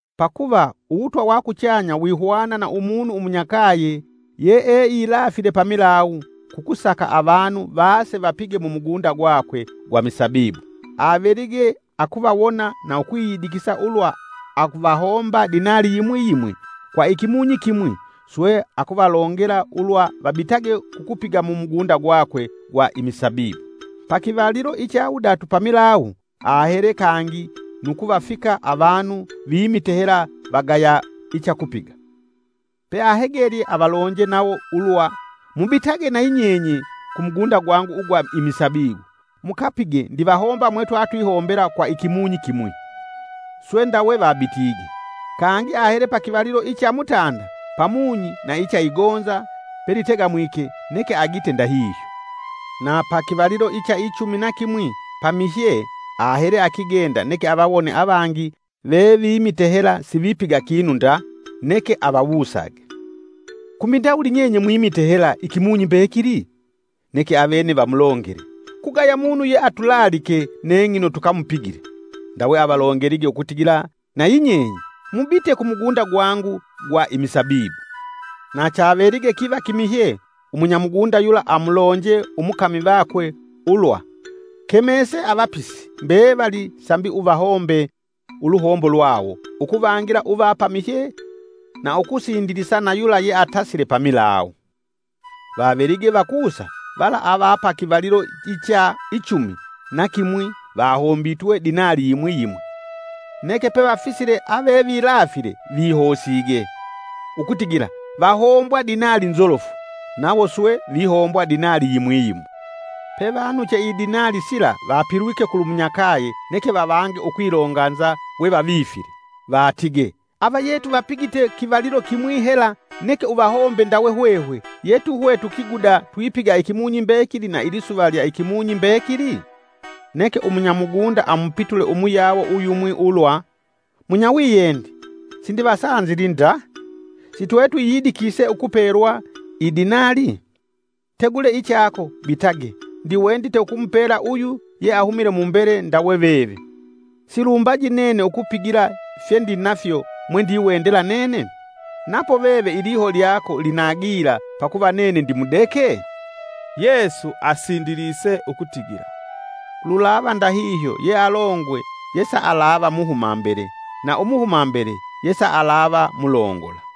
“Pakuva Uwutwa wa Kuchanya wihwana na Umunu umunyakaye yeeilafile pamilawu, kukusaka avanu vaase vapige mumugunda gwakwe gwa misabibu. Avelige akuvawona, na ukwiyidikisa ulwa avahomba dinali yimwi yimwi kwa ikimunyi kimwi, swe akuvalongela ulwa vabitage kukupiga mumugunda gwake gwa imisabibu. Pa kivalilo icha wudatu pamilawu ahele kangi nu kuvafika avanu vimite hela vagaya ichakupiga, pe ahegelye avalonje nawo ulwa, ‘Mubitage na yinyenye kumugunda gwangu ugwa imisabibu mukapige ndivahomba mwe twatwihombela kwa ikimunyi kimwi!’ swe ndawe vabitige. Kangi ahele pa kivalilo icha mutanda pamunyi na icha igonza pelitegamwike, neke agite ndahihyo. Na pa kivalilo icha ichumi na kimwi pamihye ahele akigenda neke avawone avangi vevimite hela sivipiga kinu nda neke avawusage, ‘Kumbi ndawuli nyenye mwimile hela ikimunyi mbekili?’ Neke avene vamulongele, ‘Kugaya munu yeatulaalike neng'ino tukamupigile.’ Ndawe avalongelige ukutigila nayi nyenye, ‘Mubite kumugunda gwangu gwa imisabibu.’” “Na chavelige kiva kimihye umunya mugunda yula amulonje umukami vakwe ulwa: ‘Kemese avapisi mbevali sambi uvahombe uluhombo lwawo ukuvangila uva pamihye na ukusindilisa na yula yeatasile pamilawu.’ Vavelige vakusa vala ava pa kivalilo icha ichumi na kimwi vahombitwe dinali yimwi yimwi. Neke pevafisile avevilafile vihosige ukutigila vahombwa dinali nzolofu; nawo swe vihombwa dinali yimwi yimwi. Pe vanuche idinali sila vapilwike kulumunyakaye neke vavange ukwilonganza we vavifile. Vatige: ‘Avayetu vapigite kivalilo kimwi hela neke uvahombe ndawe hwehwe ye tuhwe tukiguda twipiga ikimunyi mbekili na ilisuva lya ikimunyi mbekili?’ Neke umunyamugunda amupitule umuyawo uyumwi ulwa: ‘Munyawiyendi, sindivasanzili nda! Si twe twiyidikise ukupelwa idinali? Tegule ichako, bitage, ndiwendite ukumupela uyu yeahumile mumbele ndawe veve. Silumbaji nene ukupigila fyendinafyo mwe ndiwendela nene? Napo veve iliho lyako lina gila pakuva nene ndimudeke?’” Yesu asindilise ukutigila, “Lulava ndahihyo yealongwe yesaalava muhuma mbele na umuhuma mbele yesaalava mulongola.”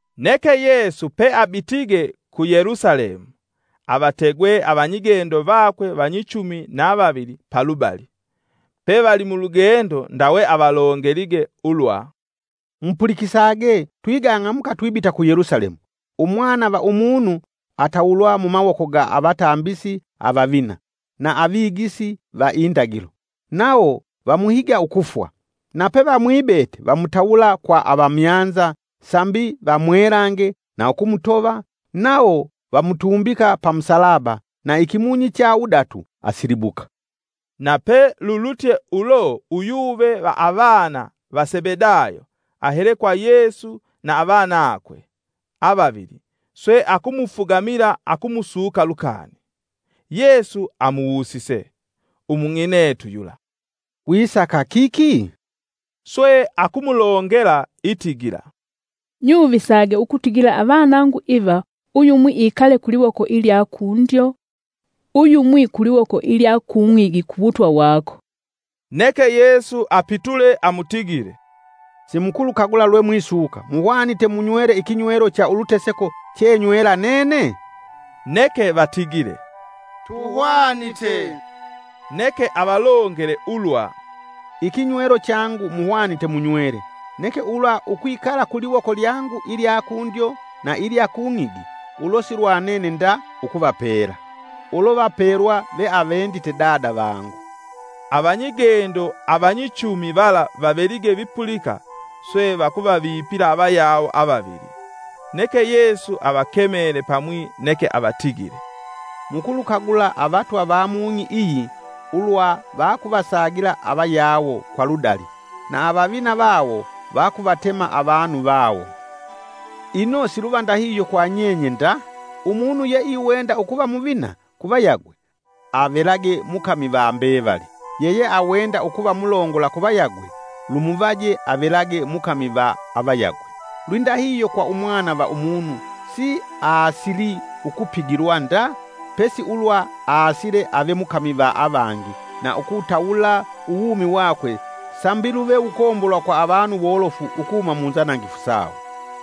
Neke Yesu peabitige ku Yelusalemu, avategwe avanyigendo vakwe vanyichumi na vavili palubali, pevali mulugendo ndawe avalongelige ulwa, “Mupulikisage twigang'amuka twibita ku Yelusalemu, Umwana va Umunu atawulwa mumawoko ga avatambisi avavina, na avigisi va indagilo. Nawo vamuhiga ukufwa. Na pe vamwibete vamutawula kwa Avamyanza, sambi vamwelange na ukumutova, nawo vamutumbika pa musalaba, na ikimunyi icha wudatu asilibuka.” Na pe lulutye ulo uyuve va avana va Sebedayo ahele kwa Yesu na avanakwe avavili swe akumufugamila akumusuka lukani. Yesu amuwusise umung'inetu yula, “Wisaka kiki?” Swe akumulongela itigila, “Nyuvisage ukutigila avanangu iva Uyumwi ikale kuliwoko ilya kundyo, Uyumwi kuliwoko ilya kung'igi ku wutwa wako.” Neke Yesu apitule amutigile, “Simukulukagula lwe mwisuka muhwanite munywele ikinywelo cha uluteseko chenywela nene?” Neke vatigile, “Tuhwanite.” Neke avalongele ulwa, “Ikinywelo changu muhwanite munywele neke ulwa ukwikala kuliwoko lyangu ilya kundyo na ilya kung'igi ulo silwanene nda ukuvapela! Ulo vapelwa ve awendite Dada vangu.” Avanyigendo avanyichumi vala vavelige vipulika swe vakuvavipila avayawo avavili. Neke Yesu avakemele pamwi neke avatigile, “Mukulukagula avatwa va mung'i iyi ulwa vakuvasagila avayawo kwa ludali, na avavina vawo vakuvatema avanu vawo. Ino siluva ndahihyo kwa nyenye nda! Umunu yeiwenda ukuva muvina kuvayagwe avelage mukami va mbevali. Yeyeawenda ukuva mulongola kuvayagwe lumuvaje avelage mukami va avayagwe. Lwindahihyo kwa Umwana va Umunu si aasili ukupigilwa nda pesi ulwa aasile ave mukami va avangi na ukutawula uwumi wakwe sambi luve wukombolwa kwa avanu wolofu ukuhuma munzanangifu sawo.”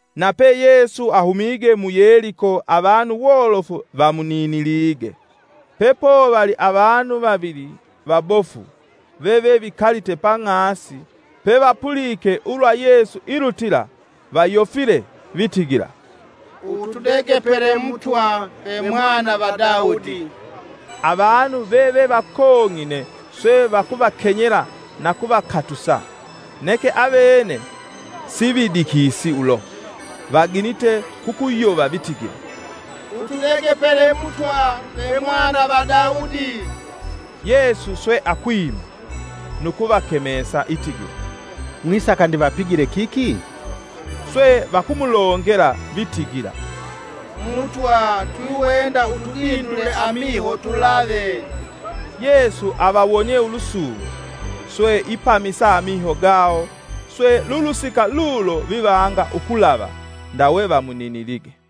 Nape Yesu ahumige mu Yeliko avanu wolofu vamuninilige. Pepovali avanu vavili vabofu vevevikalite pa ng'asi pevapulike ulwa Yesu ilutila, vayofile, vitigila, “Utudegepele Mutwa ve Mwana va Daudi!” Avanu vevevakong'ine swe vakuvakenyela nu kuvakatusa, neke avene sividikisi ulo vaginite kukuyova vitigila, “Utudegepele Mutwa ve Mwana va Daudi!” Yesu swe akwima, nu kuvakemesa itigila, “Mwisaka ndivapigile kiki?” Swe vakumulongela vitigila, “Mutwa twiwenda utudindule amiho tulave.” Yesu avawonie ulusungu, swe ipamisa amiho gawo, swe lulusika lulo vivanga ukulava ndawe vamuninilige.